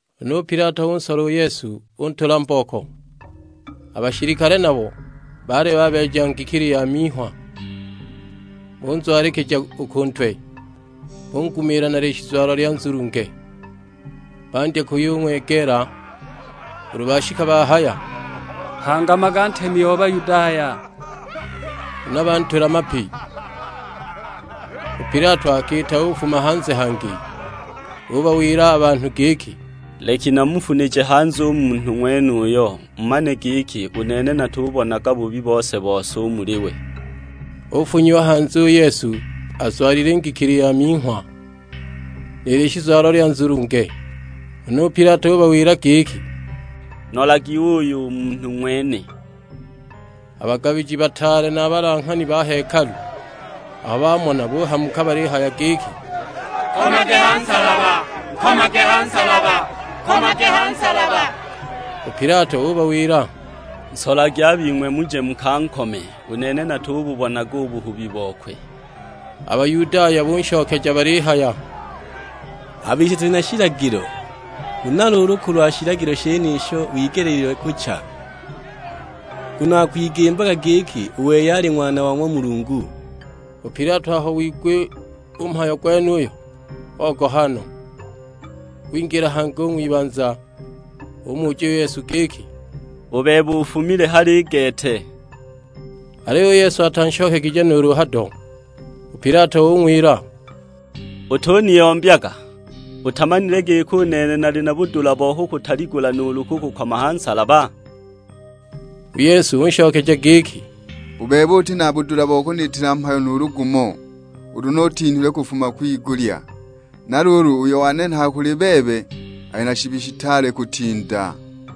Huna u Pilato unsola u Yesu, untula mbooko. A bashilikale nabo baali babeeja ngikili ya minghwa, bunzwalikija u ku ntwe, bungumiila na lishizwalo lya nzulunge. Bandya kuyung'wegeela: ulu bashika bahaya, "Hangamaga ntemi o Bayudaya"; huna bantula mapi! U Pilato akiita ufuma hanze hangi, ubawila a banhu giki, "Leki namufunije hanze u munhu ng'wenuyo, mumane giki u nene natubonaga bubi bose-bose u muli we." Ufunyiwa hanze u Yesu azwalile ngikili ya minghwa, ni lishizwalo lya nzulunge; huna u Pilato ubawila giki, "Nolagi uuyu u munhu ng'wene!" A bagabiji bataale na a balanghani ba hekalu aho bamona buhamuka balihaya giki, "Nkomage ha nsalaba, nkomage ha nsalaba!" U Pilato ubawila, "Nsolagi a bing'we muje mukankome; u nene natububonaga u buhubi bokwe." A Bayudaya bunshokeja balihaya, "A bise tuli na shilagilo, huna luulu kulwa shilagilo shenisho wigeleelagwa kucha, nguno akwigimbaga giki u wei ali Ng'wana o ng'wa Mulungu!" U Pilato aho wigwa u mhayo gwenuyo ogoha no. Wingila hangi u ng'wibanza; umuja u Yesu giki, "U bebe ufumile hali i gete?" Aliyo u Yesu atanshokegije nuulu hado! U Pilato ung'wila, "Utuniyombyaga, utamanile giki u nene nali na budula bo kukutaligula nuulu kukukoma ha nsalaba?" U Yesu unshokeja giki, "U bebe uti na budula bo kuniitila mhayo nuulu gumo ulu ni utinhilwe kufuma kwigulya; na luulu uyo wanenhaga kuli bebe ali na shibi shitaale kutinda!"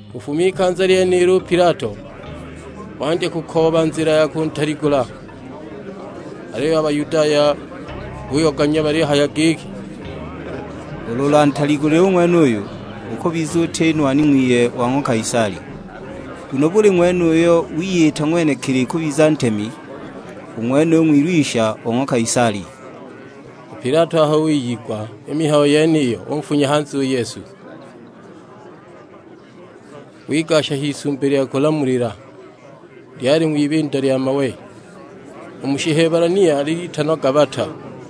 Kufuma ikanza lyenilo u Pilato wandya kukooba nzila ya kuntaligula; aliyo a Bayudaya buyoganya balihaya giki, "Ulu ulantaligule u ng'wenuyu, ukubiza uti nwani ng'wiye wa ng'wa Kaisali; nguno buli ng'wene uyo wiyita ng'wenekili kubiza ntemi, u ng'wenuyo ng'wilwisha o ng'wa Kaisali." U Pilato aho wiyigwa i mihayo yeniyo unfunya hanze u Yesu, wigasha h'isumbi lya kulamulila, lyali ng'wibindo lya mawe (u mu Shihebulania litanwa Gabata).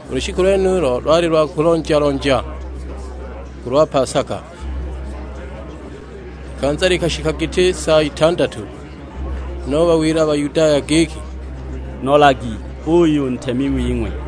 U lushiku lwenulo lwali lwa kulonja-lonja kulwa pasaka; i likanza likashika giti sa itandatu. Huna ubawila a Bayudaya giki, "Nolagi uuyu u ntemi wing'we!"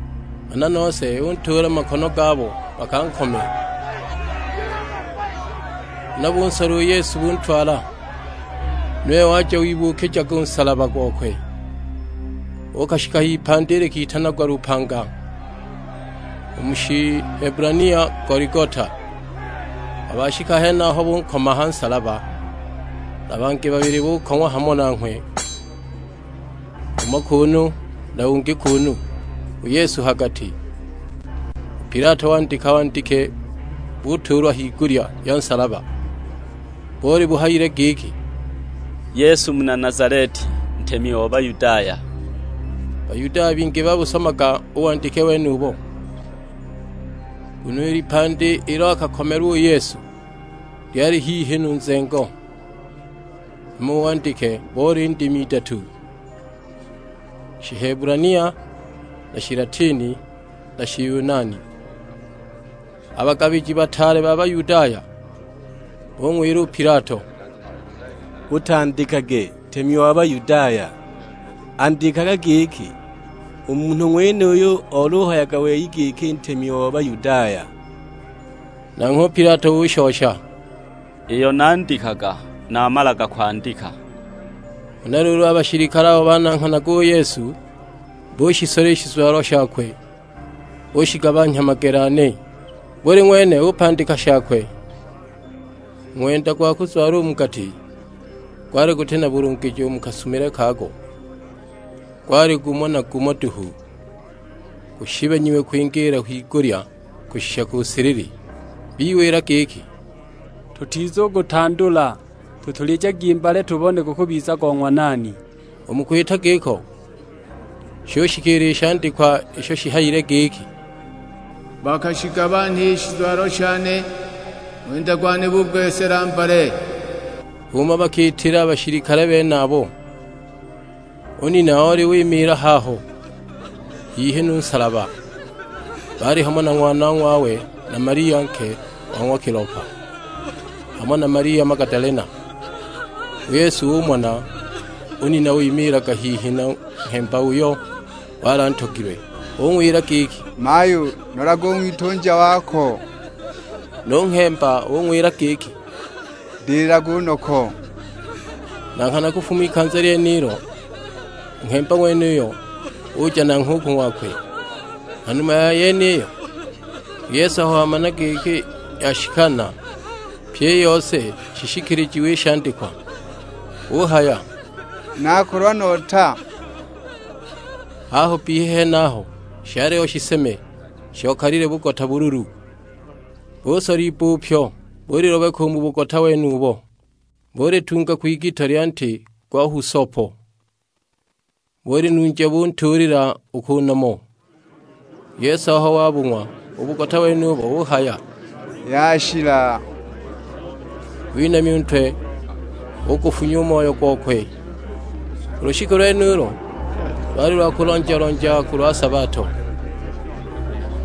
Nghana nose untuula mu makono gabo, bakankome! Huna bunsola u Yesu buntwala. Nuwe waja wibuukijaga u nsalaba gokwe, uukashika h'ipandi likitanagwa lupanga: u mu Shihebulania Goligota. Aho bashika henaho bunkoma a ha nsalaba; na bangi babili bukong'wa hamo nanghwe: umo kuunu na ungi kuunu, u Yesu ha gati. U Pilato wandika wandike butuulwa a higulya ya nsalaba; boli buhayile giki, "Yesu muna Nazaleti, ntemi o Bayudaya." Bayudaya bingi babusomaga u wandike wenubo, nguno i lipandi ilo akakomelwa u Yesu lyali hihi nu nzengo; hama u wandike boli ndimi idatu: Shihebulania, na Shilatini, na Shiyunani. A bagabiji bataale ba Bayudaya bung'wila u Pilato, "Utandikage 'Ntemi wa Bayudaya,' andikaga giki, 'U munhu ng'wenuyu olihayaga wei giki ntemi o Bayudaya.' " Nanghwe u Pilato ushosha, "Iyo nandikaga namalaga kwandika!" Huna luulu a bashilikale abo bananghanaga u Yesu bushisola i shizwalo shakwe bushigabanhya magele ane, buli ng'wene upandika shakwe. U ng'wenda gwa kuzwala mu gati gwali guti na bulungijo u mu kasumilwe kago, gwali gumo na gumo duhu; gushibanyiwe kwingiila kwigulya kushisha ku silili. Biwila giki, "Tutizugutandula, tutulijagi mbale tubone gukubiza go ng'wa nani." U mu kwita giko shushikiila i shandikwa isho shihayile giki, "Bakashigabanha i shizwalo shane, ng'wenda gwane bugwesela mbale!" H'umo bakiitila a bashilikale benabo. U nina oli wimiila haho hihi nu nsalaba; baali hamo na ng'wanong'wawe, na Malia nke wa ng'wa Kilopa, hamo na Malia Magadalena. U Yesu umona u nina wimiilaga hihi nu nghemba uyo wali antogilwe; ung'wila giki, "Mayu nolage u ng'witunja wako." Nu nghemba ung'wila giki, "Ndililage u noko!" Na nghana kufuma ikanza lyenilo u nghemba ng'wenuyo uja nanghwe ku ng'wakwe. Ha numa ya yeniyo, u Yesu aho wamana giki yashikana pyi i yose shishikilijiwe i shandikwa, uhaya; "Nakolwa nota." Haho bbihi henaho shaliho shiseme shokalile bugota bululu, busola ibbupyo bulilobeka u mu bugota wenubo, bulitunga kwigito lya nti gwa husopo, bulinunja buntuulila u ku nomo. U Yesu aho wabung'wa u bugota wenubo uhaya, "Yashila!" Winamya u ntwe ugufunya u moyo gokwe. U lushiku lwenulo lwali lwa kulonja-lonja kulwa sabato;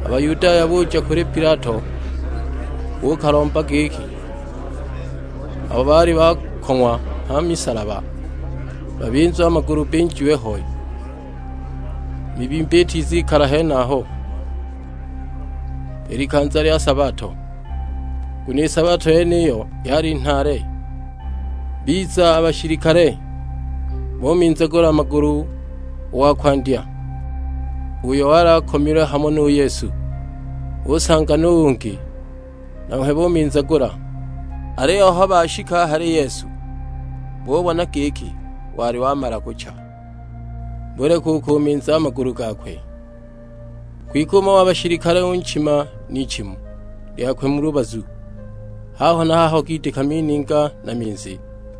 a Bayudaya buja u kuli Pilato buukalomba giki abo baali bakong'wa ha misalaba babinzwe a magulu binjiwe ho, i mibimba itizikala henaho i likanza lya sabato; nguno i sabato yeniyo yali nhaale. Biza a bashilikale, buminzagula a magulu u wa kwandya, uyo wali akomilwe hamo nu Yesu. Bunsanga nu ungi, nanghwe buminzagula. Aliyo aho bashika a hali Yesu, bubona giki wali wamala kucha, buleka u kuminza a magulu gakwe. Kwike umo wa bashilikale unchima n'ichimu lyakwe mu lubazu; haho na haho gidika mininga na minzi!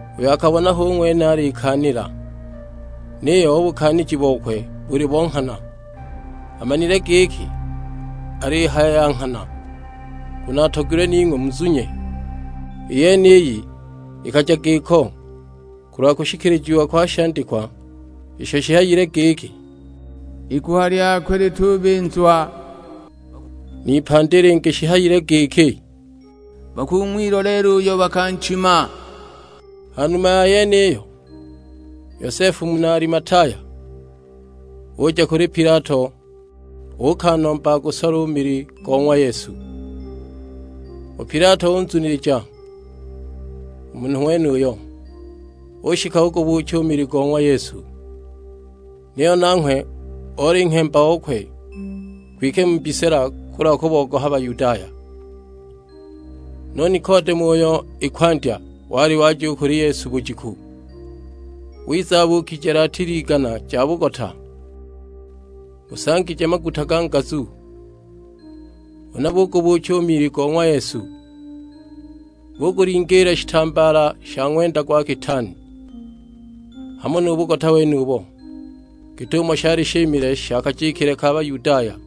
Uyo akabona hu ng'wene alikaanila, niyo u bukaaniji bokwe buli bo nghana. Amanile giki alihaya ya nghana, nguno atogilwe ning'we muzunye. I yeniyi ikaja giko kulwa kushikilijiwa kwa shandikwa isho shihayile giki, "Iguha lyakwe litubinzwa." N'ipandi lingi shihayile giki, "Bakung'wiloleela uyo bakanchima!" Ha numa ya yeniyo Yosefu muna Alimataya uja u kuli Pilato, uukanomba agusole u mili go ng'wa Yesu. U Pilato unzunilija u munhu ng'wenuyo, ushika ugubuucha u mili go ng'wa Yesu. Niyo nanghwe oli nghemba okwe, kwike mu mbisila kulwa kubogoha Bayudaya. Nu Nikodemo uyo i kwandya wali waja u kuli Yesu bujiku, wiza abuukije latili igana ja bugota, busangije maguta ga ngazu. Huna bugubuucha u mili go ng'wa Yesu, bugulingiila shitambaala sha ng'wenda gwa kitaani, hamo nu bugota wenubo; git'umo shali shimile sha kajikile ka Bayudaya.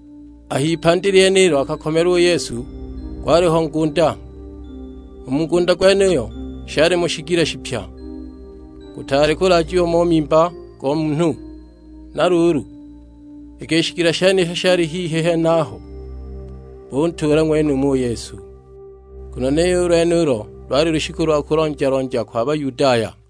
A h'ipandi lyenilo akakomelwa u Yesu gwaliho ngunda: u mu ngunda gwenuyo shalimo shigila shipya, gutaali kulaajiwa mo mimba go munhu. Na luulu iki i shigila shenisho shali hihi henaho, buntuula ng'wenumo u Yesu; nguno niyo u lwenulo lwali lushiku lwa kulonja-lonja kwa Bayudaya.